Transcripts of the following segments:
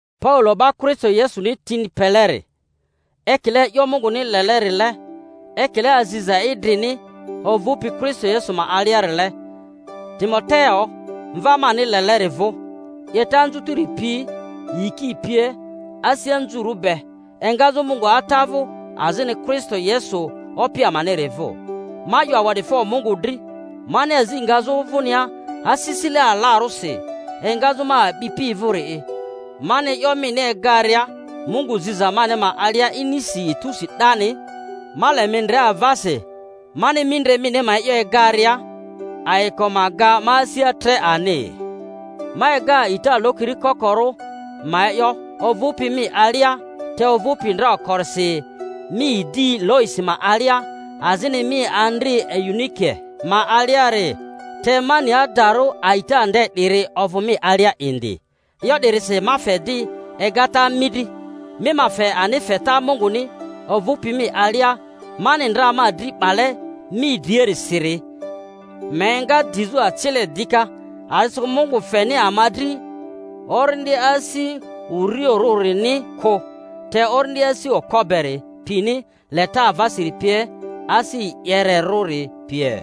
Paulo, 'ba Kristo Yesuni tini peleri, ekile e'yo Munguni lele-rile ekile aziza idrini ovᴜpi Kristo Yesu ma aliarile, Timoteo, mva mani leleri vᴜ: 'Yeta anzutiri pi, yiki pie. asi anzurᴜ be, engazᴜ Mungu Ata vᴜ azini Kristo Yesu Opi amaniri vᴜ. Ma 'yo awa'difo Mungu dri, mani azi ngazᴜ vᴜnia asisile alarᴜsi engazᴜ ma a'bipi vᴜri'i, mani e'yo mini egaria Mungu ziza mani ma alia inisi etusi 'dani. Ma le mi ndre avasi, mani mindre mini ma e'yo egaria, ayiko ma ga ma asia tre ani. Ma ega a'ita lokiri kokorᴜ ma e'yo ovᴜpi mi alia, te ovᴜpi ndra okorisi mi idi Loisi ma alia azini mi andri Eunike ma aliari, te ma ni adarᴜ a'ita nde 'diri ovᴜ mi alia indi. E'yo 'dirisi ma fe di egata mi dri. mi ma fe ani feta Munguni ovᴜpi mi alia mani ndra ma dri 'bale mi driarisiri ma enga dizᴜ acile dika; a'disikᴜ Mungu feni ama dri orindi asi urioᴜrᴜrini kᴜ, te orindi asi okpo beri pini, leta avasiri pie, asi e'yere-rᴜri pie.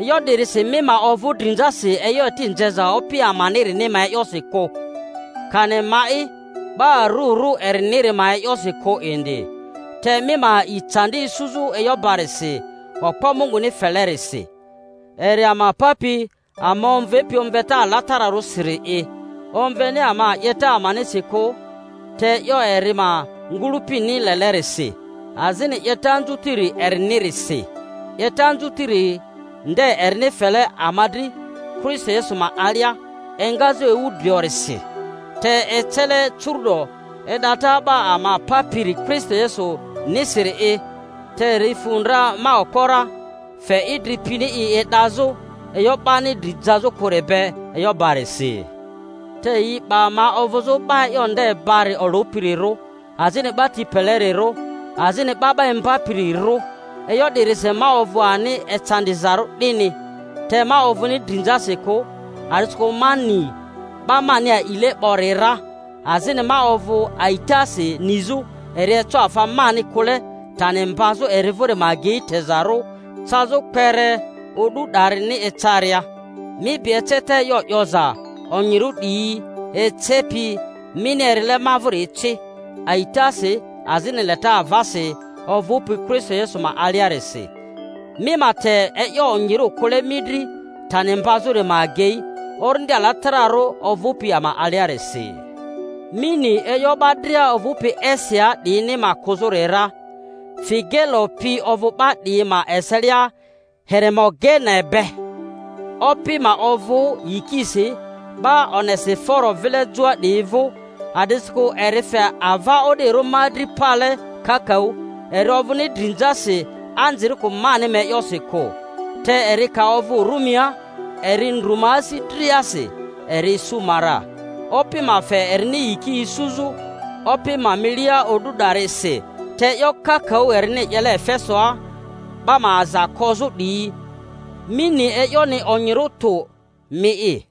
E'yo 'dirisi mi ma ovᴜ drinzasi e'yo eti nzeza Opi amanirini ma e'yosi kᴜ, kani ma'i 'ba arurᴜ eriniri ma e'yosi kᴜ indi, te mi ma a'i candi isuzᴜ e'yo barisi okpo Munguni felerisi, eri ama papi, ama omvepi omveta alatararᴜsiri’i, omveni ama 'yeta amanisi kᴜ, te e'yo eri ma ngᴜlᴜpini lelerisi, azini 'yeta anzutiri erinirisi, 'yeta anzutiri nde erini fele ama dri Kristo Yesu ma alia engazᴜ ewu driorisi, te ecele curu'do e'data 'Ba ama Papiri Kristo Yesu-nisiri’i, te eri fu dra ma okpo ra, fe idri pini i e'dazᴜ e'yo 'bani dri jazᴜ kᴜri be e'yo barisi. Te yi 'ba ma ovᴜzᴜ 'ba e'yo nde bari olᴜpirirᴜ, azini 'ba ti pelerirᴜ, azini 'ba 'ba imbapirirᴜ; e'yo 'dirisi ma ovᴜ ani ecandizarᴜ 'dini. Te ma ovᴜni drinzasi kᴜ, a'disikᴜ ma ni 'ba mani alile 'bori ra, azini ma ovᴜ a'itasi nizᴜ eri eco afa mani kᴜle tani mbazᴜ eri vᴜri ma agei tezarᴜ cazᴜ kpere o'du 'darini ecaria. Mi bi eceta e'yo 'yoza onyirᴜ 'diyi ecepi, mini erile ma vᴜri ci, aitasi azini leta avasi ovᴜpi Kristo Yesu ma aliarisi; mi ma te e'yo onyirᴜ kᴜle mi dri tani mbazᴜri ma agei, Orindi Alatararᴜ ovᴜpi ama aliarisi. Mi ni e'yo 'ba dria ovᴜpi Asiaa 'diyini ma kᴜzᴜri ra; Figelo pi ovᴜ 'ba 'diyi ma eselia Heremogene be. Opi ma ovᴜ yikisi 'ba Onesiforo vile joa 'diyi vᴜ, a'disikᴜ eri fe ava o'dirᴜ ma dri pale kakaᴜ; eri ovᴜni drinzasi anzirikᴜ mani ma e'yosi kᴜ, te eri ka ovᴜ Rumia eri ndru ma asi driasi, eri isu ma ra— Opi ma fe erini yiki isuzᴜ Opi ma milia o'du 'darisi—te e'yo kakaᴜ erini 'yele Efesoa 'ba ma aza kozᴜ 'diyi, mi ni e'yoni onyirᴜ tᴜ mi'i.